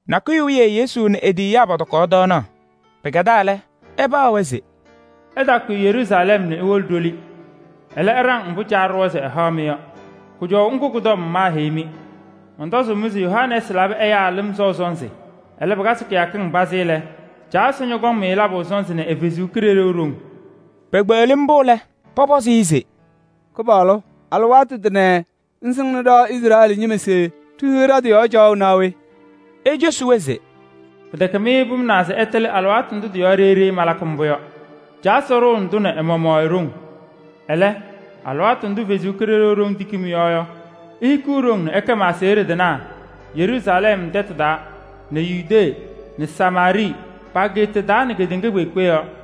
Nakʋyʋ wiye Yesu nɛ e-tiyiyaa pɔtɔkaɣ tɔɔnaɣ. Pɩkɛdaa lɛ, ɛpaɣ-wɛ se: “Ɩtaakʋyɩ Yeruusalɛm nɛ iwolo ɖoli. Ɛlɛ, ɩɖaŋ mbʋ Caa ɖʋwa se ɛhaɣ-mɩ yɔ. Kʋjɔʋ ŋgʋ kʋ-tɔm maaheyi-mɩ. Mɔntɔzʋʋ-mɩ se Yohanɛɛsɩ labɩ ɛyaa lɩm sɔʋ sɔnzɩ. Alɩwaatʋ pazɩ taa lɛ, Caa Ɛsɔ ñɔkɔŋ-mɩ labʋ sɔnzɩ nɛ ɛ-Kalɩzaɣ haʋ.” Pekpeɣli mbʋ lɛ, pɔpɔzɩ-ɩ se: “Kɩpaɣlʋ! Alɩwaatʋ tʋnɛ ŋsɩŋnɩ ɖa Izrɛɛlɩ ñɩma se ɖihiɣ ɖa-tɩ yɔɔ caɣʋ naa we?” Ecosi-wɛ se: “Pɩtɛkɛ mɩ pʋmʋnaa se ɩtɩlɩ alɩwaatʋ ndʋ tɩ-yɔɔ ɖeyi ɖeyi malakɩ mbʋ yɔ. Caa Ɛsɔ ɖʋnɩ-tʋ nɛ ɛ-maɣmaɣ e-ɖoŋ. Ɛlɛ, alɩwaatʋ ndʋ Ɛsɔ Kalɩzaɣ tiki mɩ-yɔɔ yɔ, ihikiɣ ɖoŋ nɛ ɩkɛ ma-aseɣɖe tɩnaa Yeruusalɛm tɛtʋ taa nɛ Yudee nɛ Samaarɩɩ pa-ageeta taa nɛ kedeŋa kpeekpe yɔɔ.”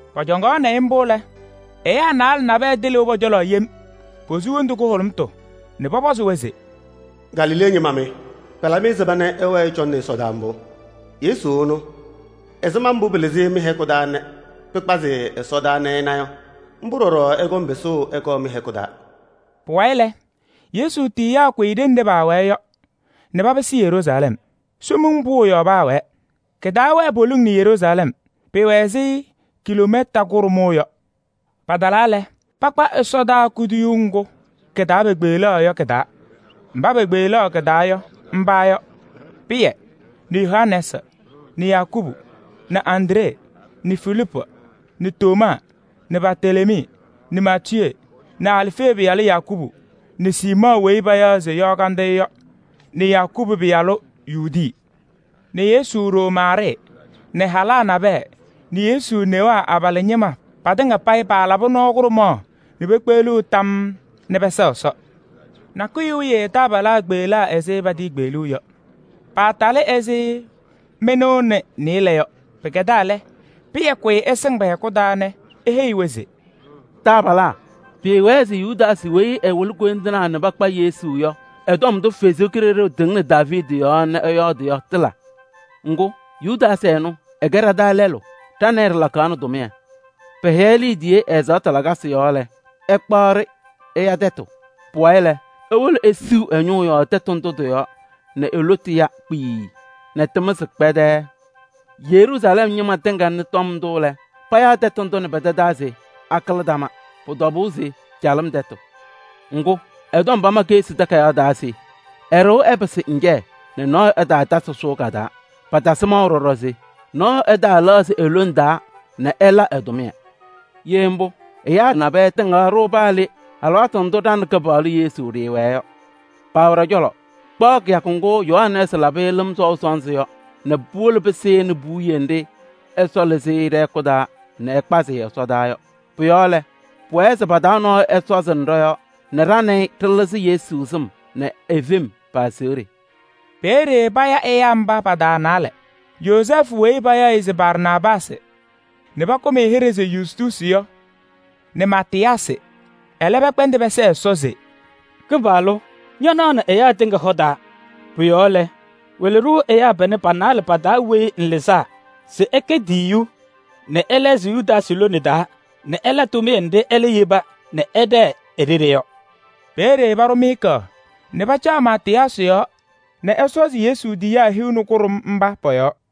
Pɔcɔŋaɣnɩ-ɩ mbʋ lɛ, ɛyaa naalɛ nabɛyɛ tɩlɩʋ pɔ-cɔlɔ yem, posu wondu kʋhʋlʋmtʋ nɛ pɔpɔzʋʋ-wɛ se: “Galilee ñɩma mɩ! Pɩlabɩ ɛzɩma nɛ ɩwɛɛ ɩcɔŋnɩ ɛsɔdaa mbʋ? Yesu ɛnʋ, ɛzɩma mbʋ pɩlɩzɩ-ɩ mɩ-hɛkʋ taa nɛ pɩkpazɩ-ɩ ɛsɔdaa nɛ ɩna yɔ, mbʋ ɖɔɖɔ ɛkɔŋ pɩsʋʋ.” Pʋwayɩ lɛ, Yesu tiyiyaa kʋyɩ ɖenɖe paawɛɛ yɔ nɛ papɩsɩ Yeruusalɛm. Somiŋ Pʋʋ yɔɔ paawɛɛ. Kɩtaawɛɛ poliŋ nɛ Yeruusalɛm, pɩɩwɛ ɛzɩ kiloomɛta kʋɖʋmʋʋ yɔ. Patalaa lɛ, pakpa ɛsɔdaa kuduyuu ŋgʋ kɩ-taa paakpeɣlaɣ yɔ. Mba pekpeɣlaɣ kɩ-taa yɔ, mba yɔ: Pɩyɛ nɛ Yohanɛɛsɩ nɛ Yakubu nɛ Andree nɛ Filiipu nɛ Tomaa nɛ Bartelemii nɛ Maatiyee nɛ Alfee pɩyalʋ Yakubu nɛ Siimɔɔ weyi payaɣ se Yɔɔ Kandɩyʋ yɔ nɛ Yakubu pɩyalʋ Yuudi nɛ Yesu ɖoo Maarɩɩ nɛ halaa nabɛyɛ nɛ Yesu newaa abalaa ñɩma patɩŋa payɩ paalabɩ nɔɔ kʋɖʋmaɣ nɛ pekpeɣliɣ tam nɛ pɛsɛɣ Ɛsɔ. Nakʋyʋ wiye taabalaa kpeɣlaa ɛzɩ patiikpeɣluu yɔ, paatalɩ ɛzɩ mɩnʋʋ nɛ nɩɩlɛ yɔ. Pɩkɛdaa lɛ, Pɩyɛ kʋyɩ ɛsɩŋ pɛ-hɛkʋ taa nɛ eheyi-wɛ se: “Taabalaa! Pɩɩwɛɛ se Yudaasɩ weyi ɛwɩlɩ koyindinaa nɛ pakpa Yesu yɔ ɛ-tɔm ndʋ Ɛsɔ Kalɩzaɣ tɩŋnɩ Daaviidi yɔɔ nɛ ɛyɔɔdɩ yɔ, tɩla. Ŋgʋ, Yudaasɩ ɛnʋ ɛkɛ ɖa-taa lɛlʋ, ɖa nɛ ɩ ɖɩlakaɣnɩ tʋmɩyɛ. Pɛhɛyɩ-ɩ liidiye ɛ-ɛzaɣtʋ lakasɩ yɔɔ lɛ, ɛkpaɣ-ɖɩ ɛya tɛtʋ. Pʋwayɩ lɛ, ewolo esiɣ ɛ-ñʋʋ yɔɔ tɩ-yɔɔ nɛ e-lotu ya kpiii nɛ tɩmɩzɩ kpɛdɛɛɛ. Yeruusalɛm ñɩma tɩŋa nɩ tɔm ndʋ lɛ, payaa tɛtʋ ndʋ nɛ pɛ-tɛ taa se: ‘Akɩlɩdama.’ Pʋ-tɔbʋʋ se calɩm tɛtʋ. Ŋgʋ, ɛ-tɔm pama Keɣsi Takayaɣ taa se: ‘Ɛ-ɖɩɣa ɛpɩsɩ ŋjɛyɛ nɛ nɔɔyʋ ɛtaatasɩ sʋʋ ka-taa.’ Patasɩ maʋ ɖɔɖɔ se: ‘Nɔɔyʋ ɛlɛɣzɩ e-lone taa nɛ ɛla ɛ-tʋmɩyɛ.’ Ye mbʋ, ɛyaa nabɛyɛ tɩŋaɣ-ɖʋ paa le, alɩwaatʋ ndʋ ɖa nɛ Kɩpaɣlʋ Yesu ɖɩɩwɛɛ yɔ. Paawɛ ɖɔ-cɔlɔ kpaɣ kɩyakʋ ŋgʋ Yohanɛɛsɩ labɩ-ɩ lɩm sɔʋ sɔnzɩ yɔ nɛ puwolo pɩsɩnɩ puwiye nɖɩ Ɛsɔ lɩzɩ-ɩ ɖɛ-hɛkʋ taa nɛ ɛkpazɩ-ɩ ɛsɔdaa yɔ. Pʋ-yɔɔ lɛ, pʋwɛɛ se pa-taa nɔɔyʋ ɛsɔzɩnɩ ɖɔ-yɔɔ nɛ ɖa nɛ ɩ ɖɩlɩzɩ Yesu sɩm nɛ e-fem pa-aseɣɖe.” Peeye paya ɛyaa mba pa-taa naalɛ: Yozɛɛfʋ weyi payaɣ se Barsaabaasɩ nɛ pakʋm-ɩ hɩɖɛ se Yustuusi yɔ nɛ Maatɩyaasɩ. Ɛlɛ pɛkpɛndɩ pɛsɛɛ Ɛsɔ se: “Kɩpaɣlʋ! Ñanaɣnɩ ɛyaa tɩŋa hɔ taa. Pʋ-yɔɔ lɛ, wɩlɩ-ɖʋ ɛyaa panɛ pa-naalɛ pa-taa weyi ŋlɩzaa se ɛkɛ tiyiyu nɛ ɛlɛɣzɩ Yudaasɩ lone taa nɛ ɛla tʋmɩyɛ nɖɩ ɛlɛ yeba nɛ ɛɖɛɛ e-ɖeɖe yɔ.” Peeye paɖʋ miika nɛ pɩcaɣ Maatɩyaasɩ yɔɔ nɛ ɛsɔzɩ Yesu tiyiyaa hiu nɛ kʋɖʋm mba pɔ-yɔɔ.